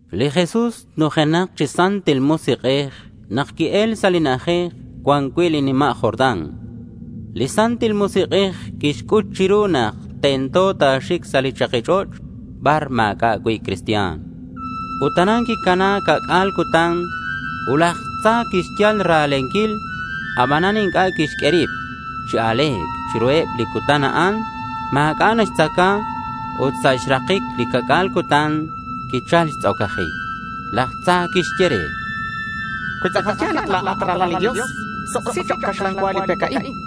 Li Jesús nujenak chi Santil Musik'ej nak qui-el sa' li na'ajej cuan cui' li nima' Jordán. Li Santil Musik'ej quixc'ut chiru nak tento ta̱xic sa' li chaki ch'och' bar ma̱c'a' cui' cristian. Ut aran quicuan ca'c'a̱l cutan. Ut laj tza quixyal ra̱lenquil. Abanan inc'a' quixq'ue rib chi a̱le̱c. Chiruheb li cutan a'an ma̱c'a' naxtzaca ut sa' xrakic li ca'c'a̱l cutan quichal xtz'ocajic. Laj tza quixye re: —Cui tz'akal ya̱l nak la̱at Ralal li Dios, suk'isi chok' caxlan cua li pec a'in, chan.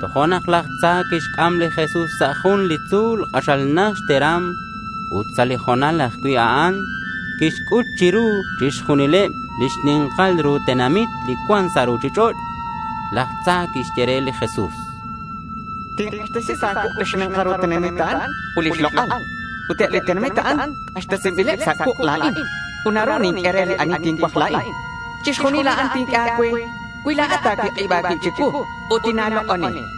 Tojo'nak laj tza quixc'am li Jesús sa' jun li tzu̱l k'axal najt xteram ut sa' li ho̱nal ajcui' a'an quixc'ut chiru chixjunileb li xni̱nkal ru tenamit li cuan sa' ruchich'och'. Laj tza quixye re li Jesús: —Tink'axtesi sa' a̱cuuk' li xni̱nkal ru tenamit a'an ut lix lok'al. Eb li tenamit a'an k'axtesinbileb sa' cuuk' la̱in ut naru ninq'ue re li ani tincuaj la̱in. Chixjunil a'an tinq'ue a̱cue cui la̱at ta̱cuik'ib a̱cuib chicuu ut tina̱lok'oni, chan.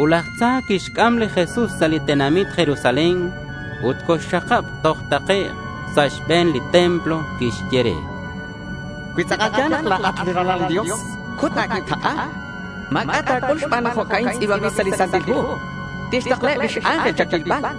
Ut laj tza quixc'am li Jesús sa' li tenamit Jerusalén ut coxxakab toj takec' sa' xbe̱n li templo. Quixye re: —Cui tz'akal ya̱l nak la̱at Ralal li Dios, cut a̱cuib tak'a. Ma̱c'a' ta̱c'ul xban nak jo'ca'in tz'i̱banbil sa' li Santil Hu: Tixtaklaheb lix ángel cha̱cuilbal.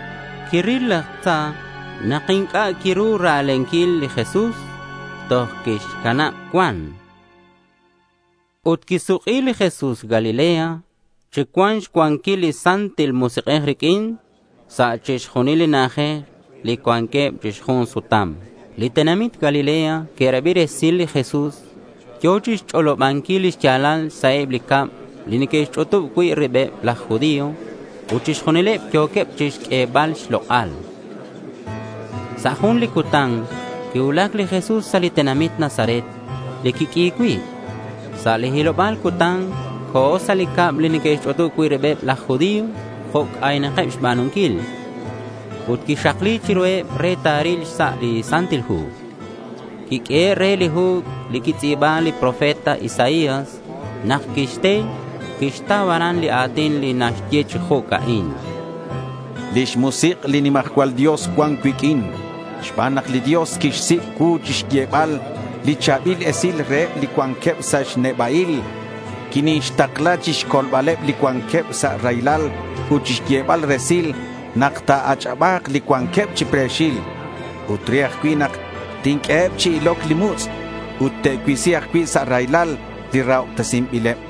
Quiril laj tza nak inc'a' quiru ra̱lenquil li Jesús, toj quixcanab cuan. Ut quisuk'i li Jesús Galilea chi cuan xcuanquil li Santil Musik'ej riq'uin. Sa' chixjunil li na'ajej li cuanqueb chi xjun sutam li tenamit Galilea, que'rabi resil li Jesús. Yo̱ chixch'olobanquil li xya̱lal sa' eb li cab li neque'xch'utub cui' ribeb laj judío. Ut chixjunileb yo̱queb chixq'uebal xlok'al. Sa' jun li cutan quicuulac li Jesús sa' li tenamit Nazaret li quiq'ui cui'. Sa' li hiloba̱l cutan co̱ sa' li cab li neque'xch'utub cui' ribeb laj judío jo' c'aynak xba̱nunquil. Ut quixakli chiruheb re ta̱ril xsa' li Santil Hu. Quiq'uehe' re li hu li quixtz'i̱ba li profeta Isaías. Nak quixte, quixtau aran li a̱tin li naxye chi jo'ca'in: Lix musik' li nimajcual Dios cuan cuiq'uin xban nak li Dios quixsic' cuu chixyebal li cha̱bil esil reheb li cuanqueb sa' neba'il. Quinixtakla chixcolbaleb li cuanqueb sa' raylal ut chixyebal resil nak te'ach'aba̱k li cuanqueb chi pre̱xil ut re ajcui' nak tinq'ueheb chi iloc li mutz' ut te'cuisi ajcui' sa' raylal li rahobtesinbileb.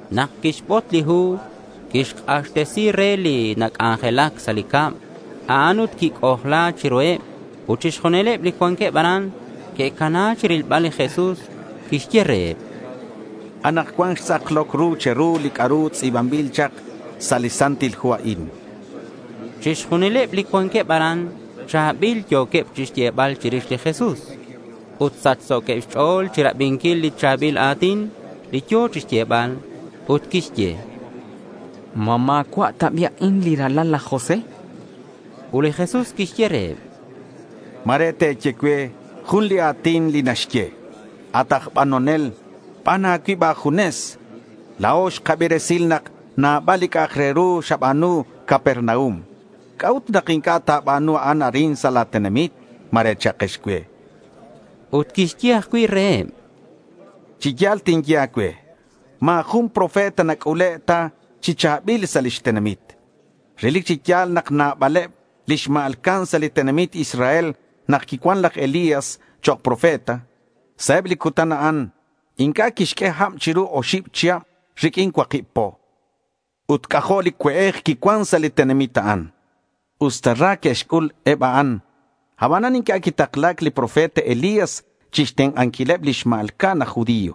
Nak quixbot li hu, quixk'axtesi re li nac'anjelac sa' li cab a'an ut quic'ojla chiruheb. Ut chixjunileb li cuanqueb aran que'cana chirilbal li Jesús. Quixye reheb: —Anakcuan xtz'akloc ru che̱ru li c'a'ru tz'i̱banbil chak sa' li Santil Hu a'in, chan. Chixjunileb li cuanqueb aran cha̱bil yo̱queb chixyebal chirix li Jesús ut sachso̱queb xch'o̱l chirabinquil li cha̱bil a̱tin li yo̱ chixyebal. Ut que'xye: —¿Ma ma̱cua' ta bi' a'in li ralal laj José? chanqueb. Ut li Jesús quixye reheb: —Ma̱re te̱ye cue jun li a̱tin li naxye: “At aj banonel, ban a̱cuib a̱junes. La̱o xkabi resil nak nabal li c'a'ak re ru xaba̱nu Capernaum. ¿C'a'ut nak inc'a' ta̱ba̱nu a'an arin sa' la̱ tenamit?” ma̱re cha'kex cue. Ut quixye ajcui' reheb: —Chi ya̱l tinye a̱cue ma̱ jun profeta nac'ule' ta chi cha̱bil sa' lix tenamit. Relic chi ya̱l nak nabaleb li xma̱lca'an sa' li tenamit Israel nak quicuan laj Elías chok' profeta. Sa' eb li cutan a'an inc'a' quixq'ue hab chiru oxib chihab riq'uin cuakib po. Ut c'ajo' li cue'ej quicuan sa' li tenamit a'an. Usta ra que'xc'ul eb a'an, aban inc'a' quitakla̱c li profeta Elías chixtenk'anquileb li xma̱lca'an aj judío.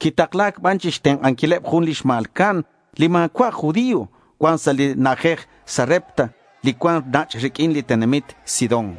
Quitakla̱c ban chixtenk'anquil jun li xma̱lca'an li ma̱cua' aj judío cuan sa' li na'ajej Sarepta li cuan nach' riq'uin li tenamit Sidón.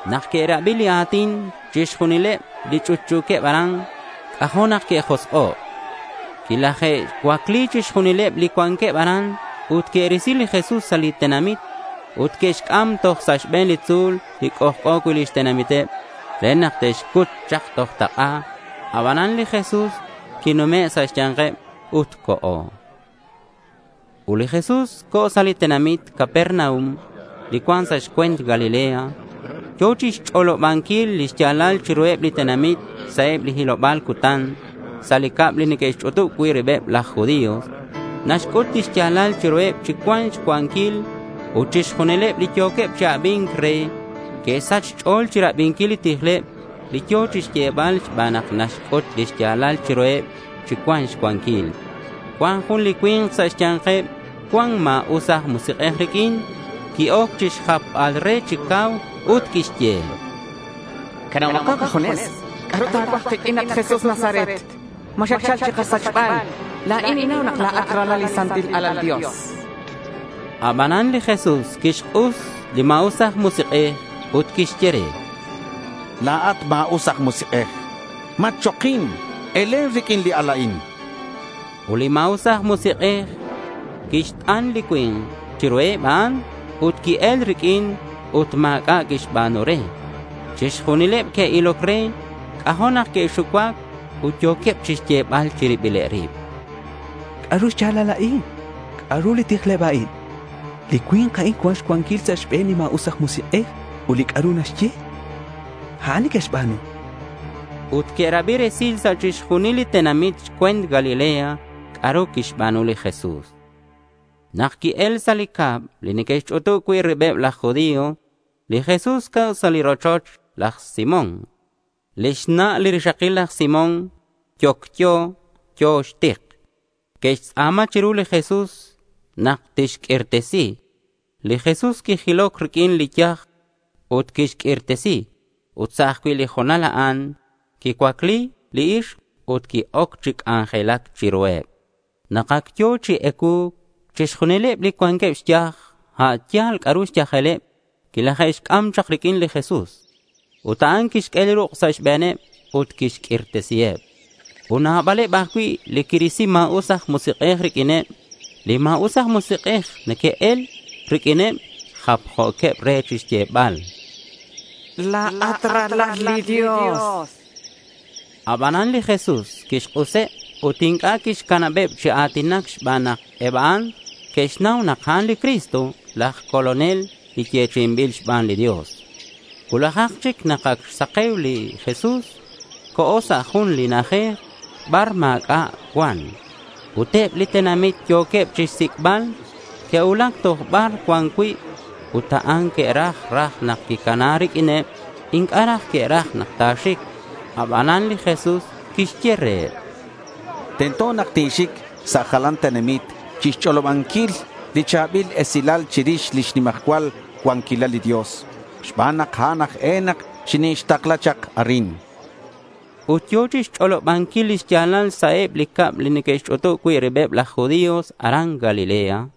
Nak que'rabi li a̱tin a'in chixjunileb li ch'utch'u̱queb aran, c'ajo' nak que'josk'o'. Quilaje'cuacli chixjunileb li cuanqueb aran ut que'risi li Jesús sa' li tenamit ut que'xc'am toj sa' xbe̱n li tzu̱l li c'ojc'o cui' lix tenamiteb re nak te'xcut chak toj tak'a. Abanan li Jesús quinume' sa' xya̱nkeb ut co̱. Li Jesús co̱ sa' li tenamit Capernaum li cuan sa' xcue̱nt Galilea. Yo̱ chixch'olobanquil li xya̱lal chiruheb li tenamit sa' eb li hiloba̱l cutan sa' li cab li neque'xch'utub cui' ribeb laj judío. Naxc'ut li xya̱lal chiruheb chi cuan xcuanquil. Ut chixjunileb li yo̱queb chi abi̱nc re que'sach xch'o̱l chirabinquil li tijleb li yo̱ chixyebal xban nak naxc'ut li xya̱lal chiruheb chi cuan xcuanquil. Cuan jun li cui̱nk sa' xya̱nkeb cuan ma̱us aj musik'ej riq'uin. Qui-oc chixjapbal re chi cau ut quixye: —Canabo kajunes. ¿C'a'ru ta̱cuaj kiq'uin, at Jesús aj Nazaret? ¿Ma xatchal chikasachbal? La̱in ninnau nak la̱at lix Santil Alal li Dios, chan. Abanan li Jesús quixk'us li ma̱us aj musik'ej ut quixye re: —La̱at ma̱us aj musik'ej, matchokin. Elen riq'uin li cui̱nk a'in, chan li Jesús. Ut li ma̱us aj musik'ej quixt'an li cui̱nk chiruheb a'an, ut qui-el riq'uin ut ma̱c'a' quixba̱nu re. Chixjunileb li que'iloc re, c'ajo' nak que'xucuac ut yo̱queb chixyebal chi ribileb rib: —¿C'a'ru xya̱lal a'in? ¿C'a'ru li tijleb a'in? Li cui̱nk a'in cuan xcuanquil sa' xbe̱neb li ma̱us aj musik'ej ut li c'a'ru naxye, a'an neque'xba̱nu, chanqueb. Ut que'rabi resil sa' chixjunileb li tenamit xcue̱nt Galilea c'a'ru quixba̱nu li Jesús. Nak qui-el sa' li cab li neque'xch'utub cui' ribeb laj judío, li Jesús co̱ sa' li rochoch laj Simón. Lix na' li rixakil laj Simón yocyo. Yo̱ xtik. Que'xtz'a̱ma chiru li Jesús nak tixq'uirtesi. Li Jesús quijiloc riq'uin li yaj ut quixq'uirtesi. Ut sa' ajcui' li ho̱nal a'an quicuacli li ixk ut qui-oc chi c'anjelac chiruheb. Nak ac yo̱ chi ecuu̱c, chixjunileb li cuanqueb xyaj, a' yal c'a'ru xyajeleb, quilaje'xc'am chak riq'uin li Jesús. Ut a'an quixq'ue li ruk' sa' xbe̱neb ut quixq'uirtesiheb. Ut nabaleb ajcui' li quirisi ma̱us aj musik'ej riq'uineb. Li ma̱us aj musik'ej nak neque'el riq'uineb, japjo̱queb re chixyebal: —La̱at Ralal li Dios, chanqueb. Abanan li Jesús quixk'useb ut inc'a' quixcanabeb chi a̱tinac xban nak eb a'an que'xnau nak a'an li Cristo, laj Colonel li yechi'inbil xban li Dios. Cuulajak chic nak ac xsake̱u, li Jesús co̱ sa' jun na'ajej bar ma̱c'a' cuan. Ut eb li tenamit yo̱queb chixsic'bal. Que'cuulac toj bar cuan cui' a'an ut que'raj raj nak quicana riq'uineb. Inc'a' raj que'raj nak ta̱xic. Abanan li Jesús quixye reheb: —Tento nak tinxic sa' jalan tenamit chixch'olobanquil li cha̱bil esilal chirix lix nimajcual cuanquilal li Dios xban nak a'an aj e nak xintakla̱c chak arin, chan. Ut yo̱ chixch'olobanquil lix ya̱lal sa' eb li cab li neque'xch'utub cui' ribeb laj judío aran Galilea.